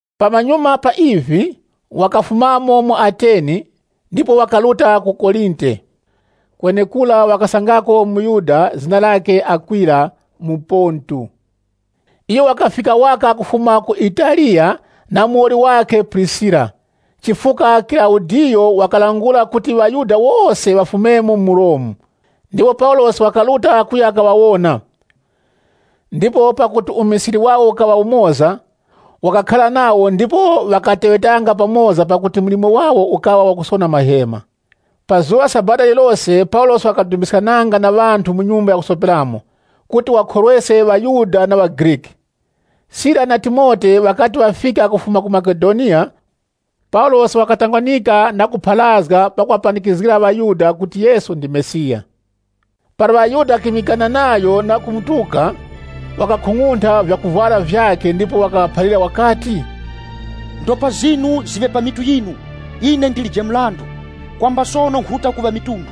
Pamanyuma pa ivi, wakafumamo mu Ateni ndipo wakaruta ku Korinte. Kwenekura wakasangako muYuda zina lakhe Akwila, muPontu. Iyo wakafika waka kufuma ku Italiya na muwoli wakhe Prisira, chifukwa Kilaudiyo wakalangula kuti ŵaYuda wose ŵafumemo mu Romu. Ndipo Paulosi wakaruta kuya kaŵawona, ndipo pakuti umisili wawo ukaŵa umoza, wakakhara nawo ndipo ŵakateŵetanga pamoza pakuti mlimo wawo ukaŵa wakusona mahema. Pa zuŵa la Sabata lirilose Paulosi wakadumbiskananga na ŵanthu mu nyumba ya kusoperamo, kuti wakhorweske ŵaYuda na ŵaGriki. Sila na Timote ŵakati ŵafika kufuma ku Makedoniya, Paulosi wakatangwanika na kupharazga pakuŵapanikizgira ŵaYuda kuti Yesu ndi Mesiya. Para ŵaYuda ŵakimikana nayo na kumutuka, wakakhung'untha vyakuvwara vyakhe ndipo wakaŵaphalira wakati, “Ndopa zinu ziŵe pa mitu yinu! Ine ndilije mrandu. Kwamba sono nkhuruta ku ŵamitundu.”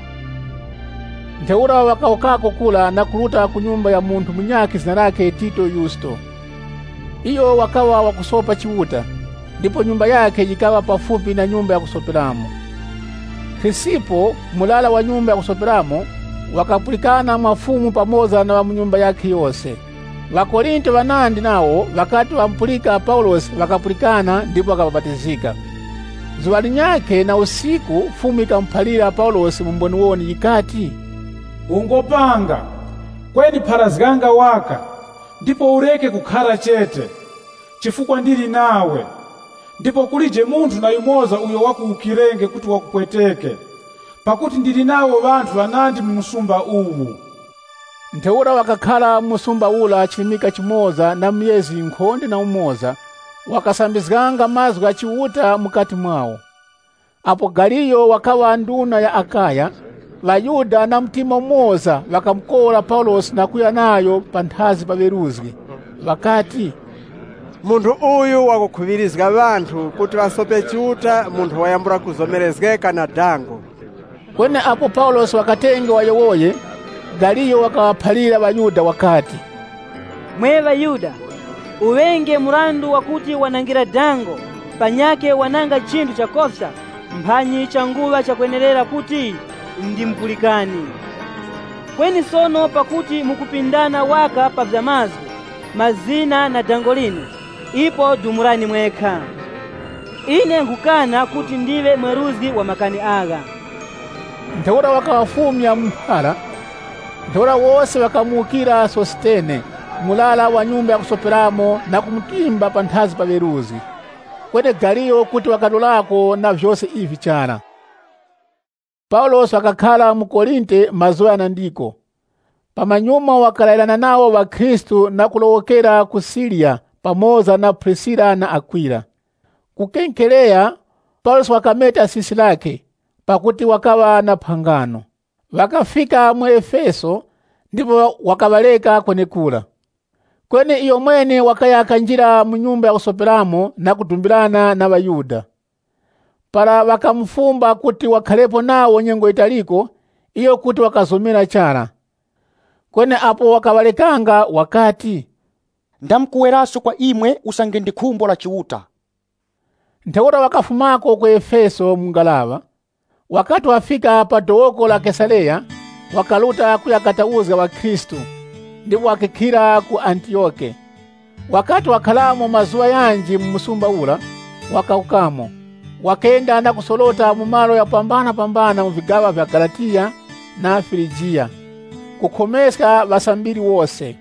Ntheura wakawukako kura na kuruta ku nyumba ya munthu munyakhe zina lakhe Tito Yusto. Iyo wakaŵa wakusopa Chiuta, ndipo nyumba yakhe yikaŵa pafupi na nyumba ya kusoperamo. Krisipo, murara wa nyumba ya kusoperamo wakapulikana mwa Fumu pamoza na ŵa mu nyumba yakhe yose. ŴaKorinte ŵanandi nawo ŵakati ŵamupulika Paulosi ŵakapulikana, ndipo wakabapatizika. Zuŵa linyakhe na usiku Fumu yikamuphalira Paulosi mu mboniwoni yikati, “Ungopanga, kweni pharazganga waka, ndipo ureke kukhara chete. Chifukwa ndili nawe. Ndipo kulije munthu na yumoza uyo wakuwukirenge kuti wakupweteke, pakuti ndili nawo ŵanthu ŵanandi mu msumba uwu.” Ntheura wakakhara mu msumba ura chirimika chimoza na myezi yinkhonde na umoza, wakasambizganga mazgu gha Chiuta mukati mwawo. Apo Galiyo wakaŵa nduna ya Akaya, ŵaYuda na mtima umoza ŵakamukora Paulosi na kuya nayo panthazi pa ŵeruzgi, ŵakati, “Munthu uyu wakukhuŵirizga ŵanthu kuti ŵasope Chiuta mu nthowa yambula kuzomerezgeka na dango.” Kweni apo Paulosi wakatenge wayowoye, Galiyo wakaŵaphalira ŵaYuda wakati, “Mwe ŵaYuda, uŵenge mrandu wakuti wanangira dango, panyakhe wananga chinthu chakofya, mphanyi changuŵa chakwenerera kuti ndimupulikani. Kweni sono pakuti mukupindana waka pa vya mazgu, mazina na dango linu, ipo dumulani mwekha. Ine nkhukana kuti ndiŵe mweruzgi wa makani agha.” Ntheura wakaŵafumya mu mphara. Ntheura wose ŵakamuwukira Sositene, murara wa nyumba ya kusoperamo na kumutimba panthazi pa ŵeruzgi. Kweni Galiyo kuti wakalorako na vyose ivi chara. Paulosi wakakhara mu Korinte mazuŵa ghanandiko. Pamanyuma wakalayirana nawo ŵakhristu na kulowokera ku Siriya pamoza na Prisira na Akwila. Ku Kenkereya, Paulosi wakameta sisi lakhe, pakuti wakachita chirapo. Ŵakafika mu Efeso, ndipo wakaŵareka kwenekura. Kweni iyomwene wakaya kanjira mu nyumba ya kusoperamo na kudumbirana na ŵaYuda. Para ŵakamufumba kuti wakharepo nawo nyengo yitaliko, iyo kuti wakazomera chara. Kweni apo wakaŵarekanga wakati, “Ndamkuweraso kwa imwe usange ndi khumbo la Chiuta.” Ntheura wakafumako ku Efeso mu ngaraŵa. Wakati wafika pa dowoko la Kesareya, wakaruta kuya katauzga ŵakhristu, ndipo wakakhilira ku Antiyoke. Wakati wakharamo mazuŵa ghanji mu msumba ura, wakawukamo. Wakenda na kusorota mu malo ghakupambanapambana mu vigaŵa vya Galatiya na Firigiya, kukhomeska ŵasambiri wose.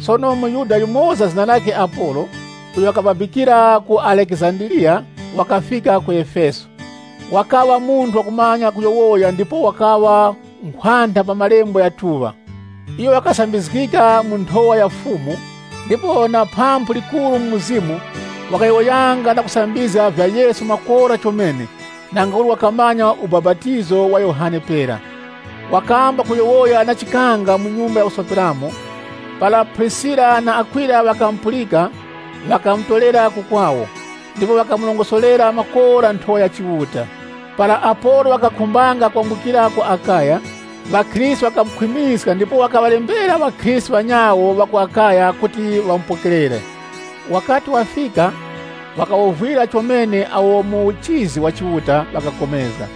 Sono muYuda yumoza zina lakhe Apolo, uyo wakababikira ku Alekizandiriya wakafika ku Efeso. Wakaŵa munthu wakumanya kuyowoya ndipo wakaŵa nkhwantha pa Malembo ghatuŵa. Iyo wakasambizgika mu nthowa ya Fumu, ndipo na phamphu likuru mu mzimu, wakayowoyanga na kusambizga vya Yesu makora chomene, nangauli wakamanya ubapatizo wa Yohane pera. Wakamba kuyowoya na chikanga mu nyumba ya kusoperamo. Para Prisira na Akwila ŵakamupulika, ŵakamutorera ku kwawo, ndipo ŵakamurongosorera makora nthowa ya Chiuta. Para Apolo wakakhumbanga kwambukira ku Akaya, ŵakhristu ŵakamukhwimiska ndipo ŵakaŵalembera ŵakhristu ŵanyawo ŵa ku Akaya kuti ŵamupokerere. Wakati wafika, wakawovwira chomene awo mu uchizi wa Chiuta ŵakapulikana.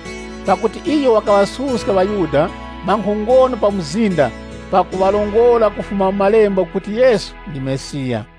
Pakuti iyo wakaŵasuska ŵaYuda mwa nkhongono pa mzinda, pakuŵarongora kufuma mu malembo kuti Yesu ndi Mesiya.